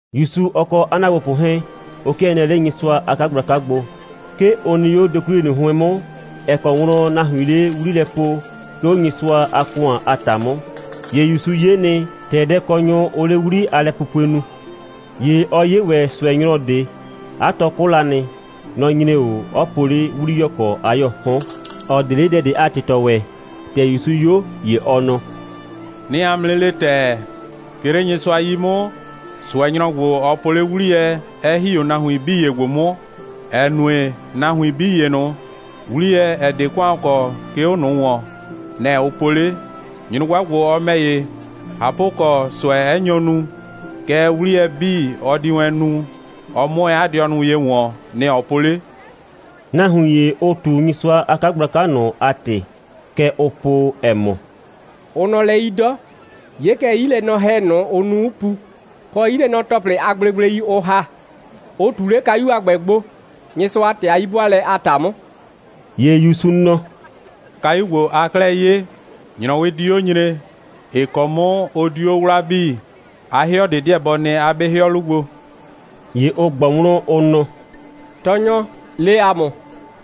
‑Yusu, ɔ kɔ 'a ‑naagbopʋ 'hɛɛn, ʋ 'kɩɛ nɩɛ 'le Nyɩsʋa a 'kagblaka gbo. 'Ke ʋ nɩ 'o dokwliye ꞊nʋ 'hʋɩn 'mʋ, ‑ɛ kɔ wlɔn nahuiin 'le 'wli lɛ po, 'ke 'o Nyɩsʋa a ‑kʋan a ‑ta 'mʋ. ‑Ye ‑Yusu 'ye nɩ, ‑tɛ dɛkɔnyʋ, ʋʋ 'le 'wli a lɛpupue nu. ‑Ye ɔ 'ye ‑wɛ ꞊sʋɛnyrɔ ꞊de. 'A tɔ 'kʋ la nɩ. Nɔ‑ nyre 'o, 'ɔ po 'le 'wliyɔkɔ a 'yɔɔ 'hɔn, ‑ɔ 'de 'le dɛ ꞊de a ‑tɩtɔ ‑wɛ. ‑Tɛ ‑Yusu 'yo, ‑ye ɔ nɔ: «'Nɩɩ 'a mʋ 'nɩ le ‑tɛɛ, 'ke 'le Nyɩsʋa 'yi 'mʋ, ꞊sʋɛnyrɔ ‑gbo, ɔ po 'le 'wliyɛ, 'ɛ ‑hi 'o nahuin 'bii ‑ye ‑gbo 'mʋ, ‑ɛ nue, nahuin 'bii ‑ye ꞊nʋ, 'wliyɛ, ‑ɛ 'de ‑kʋan kɔ, 'ke 'o ꞊nʋ ‑wɔn, nɛ‑ ʋ po 'le. Nyrʋgba ‑gbo, ɔ ‑mɛ ‑ye, ꞊hapʋkɔ, ꞊sʋɛ 'ɛ nyo nu, kɛɛ, 'wliyɛ 'bii, ɔ di wɛn nu, ɔ 'mʋ wɛn 'a dɩɔ ye ‑wɔn, nɛ‑ ɔ po 'le.» Nahuin ‑ye, ʋʋ ꞊tu Nyɩsʋa a 'kagblaka ꞊nʋ a ‑tɩ. Kɛ ʋʋ po, ‑ɛ mɔ: «Ʋ nɔ lɛ 'yi 'dɔ. 'Ye kɛ, 'yilɛnɔhɛ ꞊nʋ, ʋ nu, 'ʋ pu, kɔ 'yilɛnɔ‑tɔplɩ a gblegblei, ʋ ‑ha, ʋ ꞊tu 'le kayu a ‑gbɛ gbo, Nyɩsʋa a ‑tɩ a 'yi'bʋaalɛ a ‑ta 'mʋ.» ‑Ye ‑Yusu nɔ: «Kayu ‑gbo, aa 'klɛɛ 'ye, ‑nyrɔwɩ di 'o 'nɩ nyre, ‑ɩ kɔ 'mʋ ʋ diu 'o 'wlaa 'bii. 'A 'hɩɔ ꞊de 'deɛ bɔ nɩ 'o 'a 'be 'hɩɔ 'lu gbo.» ‑Ye ʋ ꞊gbɔ wlɔn, ʋ nɔ: «Tɔɔnyɔ, le ‑a mʋ,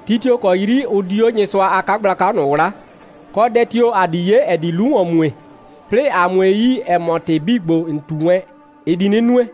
ti tio‑ kɔ 'yri ʋ di 'o Nyɩsʋa a 'kagblaka ꞊nʋ 'wlaa, kɔ dɛ tio‑ ‑a di 'ye, ‑ɛ di 'lu ‑wɔn mue, 'plɩɩ ‑a 'mue yi, ‑ɛ mɔ, ‑tɩ 'bii ‑gbo, ‑n ꞊tu wɛn, ɩ di 'nɩ nue?»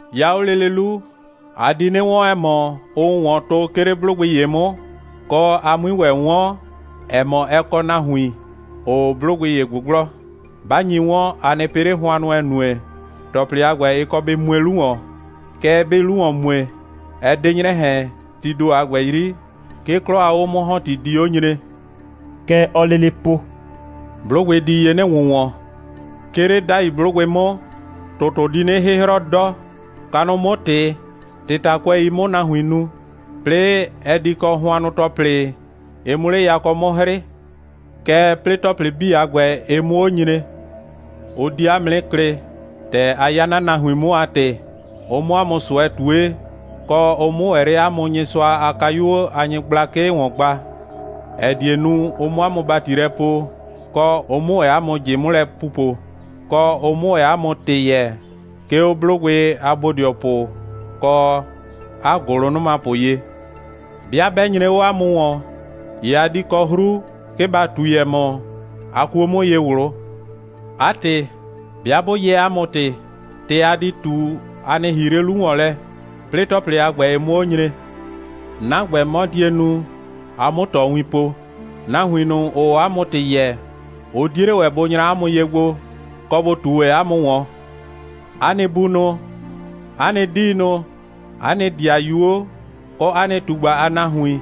'Ya 'o lele 'lu, a di 'nɩ 'wɔn, ‑ɛ mɔ, ʋʋ ‑wɔn tʋ, 'ke 'le 'blʋgbɩ ‑ye 'mʋ, kɔ, a 'mui ‑wɛ 'wɔn, ‑ɛ mɔ, ɛ kɔ nahuin, ‑ʋʋ 'blʋgbɩ ‑ye ꞊gbʋgblɔ. 'Ba nyi 'wɔn, a nɩ pɩ 'le hʋannʋ, ‑ɛ nue, ‑tɔplɩ a ‑gbɛ, ɩ kɔ bɩ mue 'lu ‑wɔn. Kɛɛ, 'bɩɩ 'lu ‑wɔn mue, ɛ 'de 'nyrɛ ꞊hɛn, tii ‑do a ‑gbɛ 'yri, 'ke 'klɔ a 'o'mʋ‑hɔnti di 'o nyre.» Kɛ ɔɔ lele po: «'Blʋgbɩ di ye 'nɩ ‑wʋnwɔn. 'Ke 'le 'dai 'blʋgbɩ 'mʋ, ‑tʋtʋ di 'nɩ 'hɩhrɔ 'dɔ, kanʋ 'mʋ ꞊tɩ, ꞊tɩtakʋɛi 'mʋ nahuin nu. 'Plɩɩ, ɛ di kɔ hʋannʋ‑tɔplɩ, ɩ 'mʋ 'le yakɔ 'mʋ 'hrɩɩ. Kɛɛ, 'plɩɩ ‑tɔplɩ 'bii a ‑gbɛ, ɩ 'mʋ 'o nyre, ʋ di 'a mʋ 'nɩ klɩ, ‑tɛ a 'ya 'na nahuin 'mʋ a ‑tɩ, ʋ 'mʋ 'a mʋ ꞊sʋɛ ꞊tue, kɔ, ʋ 'mʋ ‑wɛ 'le 'a mʋ Nyɩsʋa a kayuo a nyɩgblakɩ ‑wɔn gba, ‑ɛ die nu, ʋ 'mʋ 'a mʋ ‑bati lɛ poo, kɔ, ʋ 'mʋ ‑wɛ 'a mʋ ꞊jɩ 'mʋ lɛ pupo, kɔ, ʋ 'mʋ ‑wɛ 'a mʋ ‑tɩ yɛɛ, 'ke 'o 'blʋgbɩ a bodɩɔpʋ kɔ 'a ‑gʋlʋnʋmapʋ ye. 'Bɩa 'bɛ nyre 'o 'a mʋ ‑wɔn, ‑ye a di kɔ 'hru, 'ke ba ꞊tui, ‑ɛ mɔ, a kuo 'mʋ ye ꞊wlʋ. 'A ‑tɩ, 'bɩa 'bʋ yɛɛ 'a mʋ ‑tɩ, ‑tɩ a di ꞊tu, a nɩ ‑hii 'le 'lu ‑wɔn lɛ, 'plɩɩ ‑tɔplɩ a ‑gbɛ 'mʋ 'o nyre. 'Na ‑gbɛ, 'mɔ die nu, a 'mʋ ꞊tɔwin po. Nahuin ꞊nʋ, ‑ʋʋ 'a mʋ ‑tɩ yɛɛ, ʋ 'die 'le ‑wɛ bʋ nyra 'a mʋ ye gbo, kɔ, bʋ ꞊tu ‑wɛ 'a mʋ ‑wɔn. 'A nɩ bunʋ, 'a nɩ 'diinʋ, 'a nɩ ‑dɩayuo, kɔ 'a nɩ ꞊tugba a nahuin,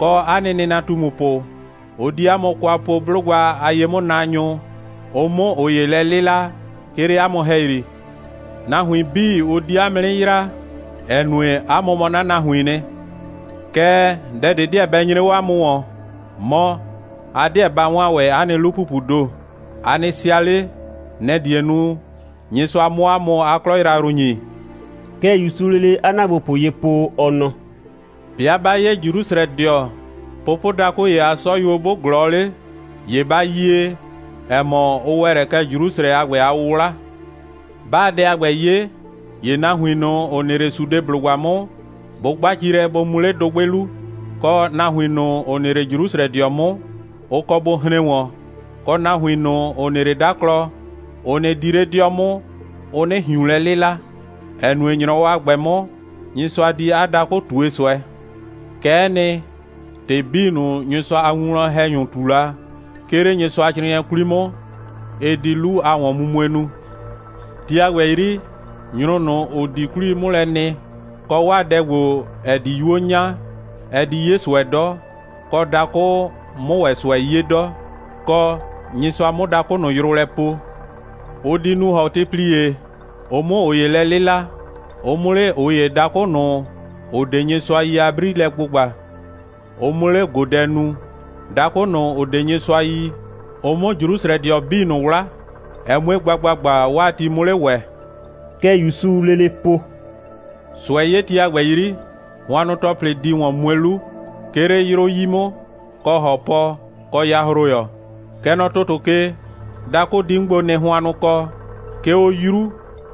kɔ 'a nɩ nɩnatumupʋ, ʋ di 'a mʋ kwa po 'blʋgba a ye'mʋnaanyʋ, ʋ 'mʋ ꞊ʋ ‑ye lɛ 'lɩla, 'ke 'le 'a mʋ ‑hɛyri. Nahuin 'bii, ʋ di 'a mʋ 'nɩ yraa, ‑ɛ nue, 'a mʋ mɔ 'na nahuiin nɩ. Kɛɛ, dɛ ꞊de 'deɛ bɛ nyre 'o 'a mʋ ‑wɔn, mɔ, a 'deɛ ba 'waan ‑wɛ 'a nɩ 'lu‑pupuu ‑do. A nɩ sɩa 'le. Nɛ‑ die nu, Nyɩsʋa 'mʋ 'a mʋ 'a 'klɔ yrayrʋ ‑nyi.» Kɛ ‑Yusuu lele 'a ‑naagbopʋ ye po, ɔ nɔ: «'Bɩa 'ba 'ye Jrusrɛdɩɔ, pʋpʋdakʋ ‑ye a 'sɔyuo 'bʋ ꞊glɔɔ 'le, ‑ye ba yie, ‑ɛ mɔ, ʋ ‑wɛ lɛ kɛ Jrusrɛ a ‑gbɛ a 'wʋwla. 'Baa dɛ a ‑gbɛ 'ye, ‑ye nahuin ꞊nʋ, ‑ʋ nɩ 'le Sudeblʋgba 'mʋ, bʋ 'gba ci lɛ, bʋ mu 'le dʋgbɩ 'lu, kɔ, nahuin ꞊nʋ, ‑ʋ nɩ 'le Jrusrɛdɩɔ 'mʋ, ʋ kɔ bʋ hren ‑wɔn, kɔ, nahuin ꞊nʋ, ‑ʋ nɩ 'le 'daklɔ, ʋ nɩ 'di 'le 'dɩɔ 'mʋ, ʋ 'nɩ ꞊hiun lɛ 'lɩla, ‑ɛ nue, ‑nyrɔwɔ a ‑gbɛ 'mʋ, Nyɩsʋa di 'a dakʋ ꞊tue ꞊sʋɛ. Kɛ'ɛ nɩ, ‑tɩ 'bii ꞊nʋ, Nyɩsʋa a winwlɔn‑hɛnyʋ ꞊tu la, 'ke 'le Nyɩsʋacrɩɩnɩɛ 'kwli 'mʋ, ɩ di 'lu a ‑wɔnmumue nu. Ti a ‑gbɛ 'yri, nyrʋ ꞊nʋ, ‑ʋ di 'kwlii 'mʋ lɛ nɩ, kɔ, 'waa dɛ ‑gbo, ‑ɛ di 'yuo 'nya, ɛ di 'ye ꞊sʋɛ 'dɔ, kɔ, dakʋ 'mʋ ‑wɛ ꞊sʋɛ 'ye 'dɔ, kɔ, Nyɩsʋa 'mʋ 'a dakʋ ꞊nʋ yrʋ lɛ poo. Ʋ di nu ‑hɔtɩplie, ʋ 'mʋ ꞊ʋ ‑ye lɛ 'lɩla, ʋ 'mʋ 'le ꞊ʋ ‑ye dakʋ ꞊nʋ, ‑ʋ 'de Nyɩsʋa yi a 'bri lɛ gbʋgba, ʋ 'mʋ 'le ꞊godɛ nu, dakʋ ꞊nʋ, ‑ʋ 'de Nyɩsʋa yi, ʋ 'mʋ Jrusrɛdɩɔ 'bii ꞊nʋ 'wla, ɛ 'mue gba ‑gbagba, 'waa nɩ ti 'mʋ 'le ‑wɛ.» Kɛ ‑Yusuu lele po: «꞊Sʋɛ'yeti a ‑gbɛ 'yri, hʋannʋ‑tɔplɩ di ‑wɔn mue 'lu, 'ke 'le 'yrʋ 'yi 'mʋ, kɔ ‑hɔpɔ, kɔ yahroyɔ. Kɛ nɔ ‑tʋtʋ ke, dakʋ di 'mʋ gbo nɩ hʋannʋkɔ, 'ke 'o 'yru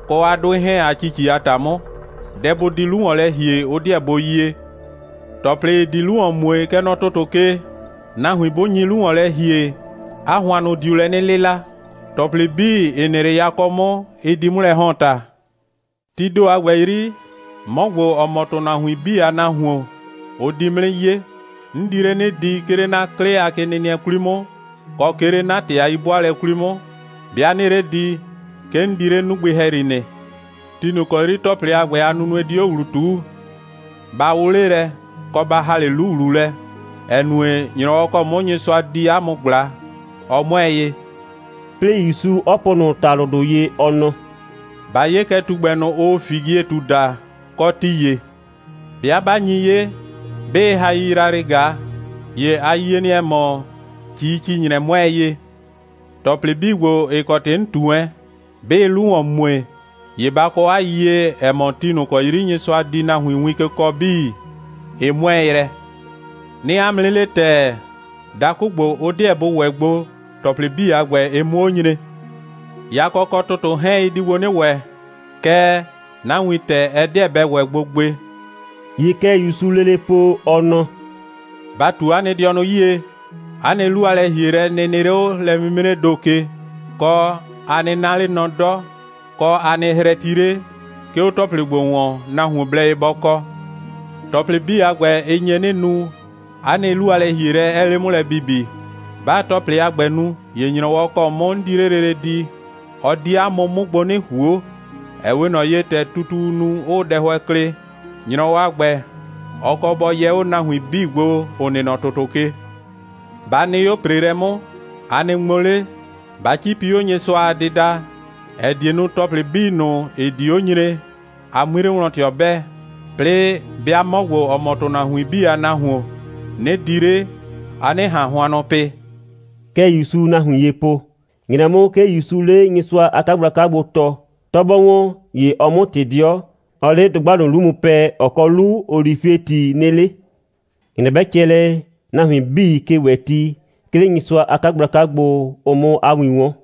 kɔ 'a 'dʋɩ 'hɛɛn a ‑cici a ‑ta 'mʋ. Dɛ bʋ di 'lu ‑wɔn lɛ ‑hie, ʋ 'deɛ bʋ yie. ‑Tɔplɩ, ‑ɩ di 'lu ‑wɔn mue, kɛ nɔ ‑tʋtʋ ke, nahuin 'bʋ nyi 'lu ‑wɔn lɛ ‑hie, 'a hʋannʋ diu lɛ 'nɩ 'lɩla. ‑Tɔplɩ 'bii, ‑ɩ nɩ 'le yakɔ 'mʋ, ɩ di 'mʋ lɛ ‑hɔn ‑ta. Tii ‑do a ‑gbɛ 'yri, 'mɔ ‑gbo, ‑ɔ mɔ ‑tʋnahuin 'bii a Nahuon, ʋ di 'mʋ 'nɩ 'ye. 'N di 'le 'nɩ di, 'ke 'le 'na 'klɩ a kenɩnɩɛ 'kwli 'mʋ, kɔ 'ke 'le 'na ‑tɩ a 'yi'bʋaalɛ 'kwli 'mʋ. 'Bɩa 'nɩɩ 'le di, 'ke 'n di 'le 'nugbɩ ‑hɛyri nɩ. Ti ꞊nʋ ‑kɔ 'yri ‑tɔplɩ a ‑gbɛ a nunue di 'o ‑wlu ꞊tuu, ba 'wʋ 'le lɛ, kɔ ba ‑ha 'le 'lu ‑wlu lɛ, ‑ɛ nue, ‑nyrɔwɔ ‑kɔ 'mʋ Nyɩsʋa di 'a mʋ ꞊gbla, ɔ 'mʋɛɛ ye.» 'Plɩɩ, ‑Yusu 'ɔ po ꞊nʋ ‑talʋdʋ ye, ɔ nɔ: «Ba 'ye kɛ tugbɛ ꞊nʋ, ʋʋ figietu daa, kɔ ti ‑ye. 'Bɩa 'ba nyi 'ye, 'bɩɩ hai yrayrɩɩ ꞊gaa, ‑ye a yie nɩ, ‑ɛ mɔ, ‑cii‑ci‑nyrɛ 'mʋɛɛ ye. ‑Tɔplɩ 'bii ‑gbo, ‑ɩ kɔ ‑tɩ 'n ꞊tu wɛn, 'bɩɩ 'lu ‑wɔn mue, ‑ye ba kɔ 'a yiyie, ‑ɛ mɔ, ti ꞊nʋ ‑kɔ 'yri Nyɩsʋa di nahuin win ke kɔɔ 'bii, ɩ 'mʋɛɛ yrɛ. 'Nɩɩ 'a mʋ 'nɩ le ‑tɛɛ, dakʋ ‑gbo, ʋ 'deɛ bʋ ‑wɛ gbo, ‑tɔplɩ 'bii a ‑gbɛ, ɩ 'mʋ 'o nyre. Yakɔ kɔ ‑tʋtʋ 'hɛɛn, ɩ di gbo 'nɩ ‑wɛ, Kɛɛ, 'na wintɛ, ɛ 'deɛ bɛ ‑wɛ gbo gbe.» ‑Ye kɛ ‑Yusuu lele po, ɔ nɔ: «Ba ꞊tu 'a nɩ dɩɔnʋ 'yie, 'a nɩ 'lu a lɛ‑hielɛ nɩ nɩ 'le 'o lɛ'mimree ‑do ke, kɔ, a nɩ 'na 'le nɔ 'dɔ, kɔ, a nɩ hrɛti 'le, 'ke 'o ‑tɔplɩ ‑gbo ‑wɔn, nahuon blɛ ye bɔ kɔ. ‑Tɔplɩ 'bii a ‑gbɛ, ɩ nye 'nɩ nu, 'a nɩ 'lu a lɛ‑hielɛ 'ɛɛ 'le 'mʋ lɛ bibi. 'Baa ‑tɔplɩ a ‑gbɛ nu, ‑ye ‑nyrɔwɔ ‑kɔ 'mʋ 'n di 'le lele di, ɔ di 'a mʋ 'mʋ gbo 'nɩ ꞊huo, ‑ɛ 'we ꞊nɔ ye, ‑tɛ tutuu nu, 'ʋʋ dɛhʋɛ klɩ. ‑Nyrɔwɔ a ‑gbɛ, ɔ kɔ bɔ yɛ 'o nahuin 'bii gbo, ‑ʋ nɩ nɔ ‑tʋtʋ ke. Ba nɩ 'o ‑preelɛ 'mʋ, a nɩ ŋmo 'le, ba 'cipi 'o Nyɩsʋa a dɩda, ‑ɛ die nu, ‑tɔplɩ 'bii ꞊nʋ, ‑ɩ di 'o nyre, a 'mui 'le wlɔn ꞊tɩɔ 'bɛɛ, 'plɩɩ, 'bɩa 'mɔ ‑gbo, ‑ɔ mɔ ‑tʋnahuin 'bii a Nahuon, 'nɩ di 'le, a 'nɩ ꞊han hʋannʋ pɩ.» Kɛ ‑Yusuu nahuin ye po. ‑Nyrɛ 'mʋ, 'ke ‑Yusuu 'le Nyɩsʋa a 'kagblaka gbo tɔɔ. 'Tɔ 'bɔ ‑wɔn, ‑ye ɔɔ 'mʋ ꞊tɩ 'dɩɔ, 'ɔɔ 'le dʋgba ꞊nʋ 'lu mu pɛɛ, ‑ɔ kɔ 'lu olifieti nɩ 'le. ‑Nyrɛ 'bɛ cɛ lɛ, nahuin 'bii ke ‑wɛ ti, 'ke 'le Nyɩsʋa a 'kagblaka gbo, ʋ 'mʋ 'a win 'wɔn.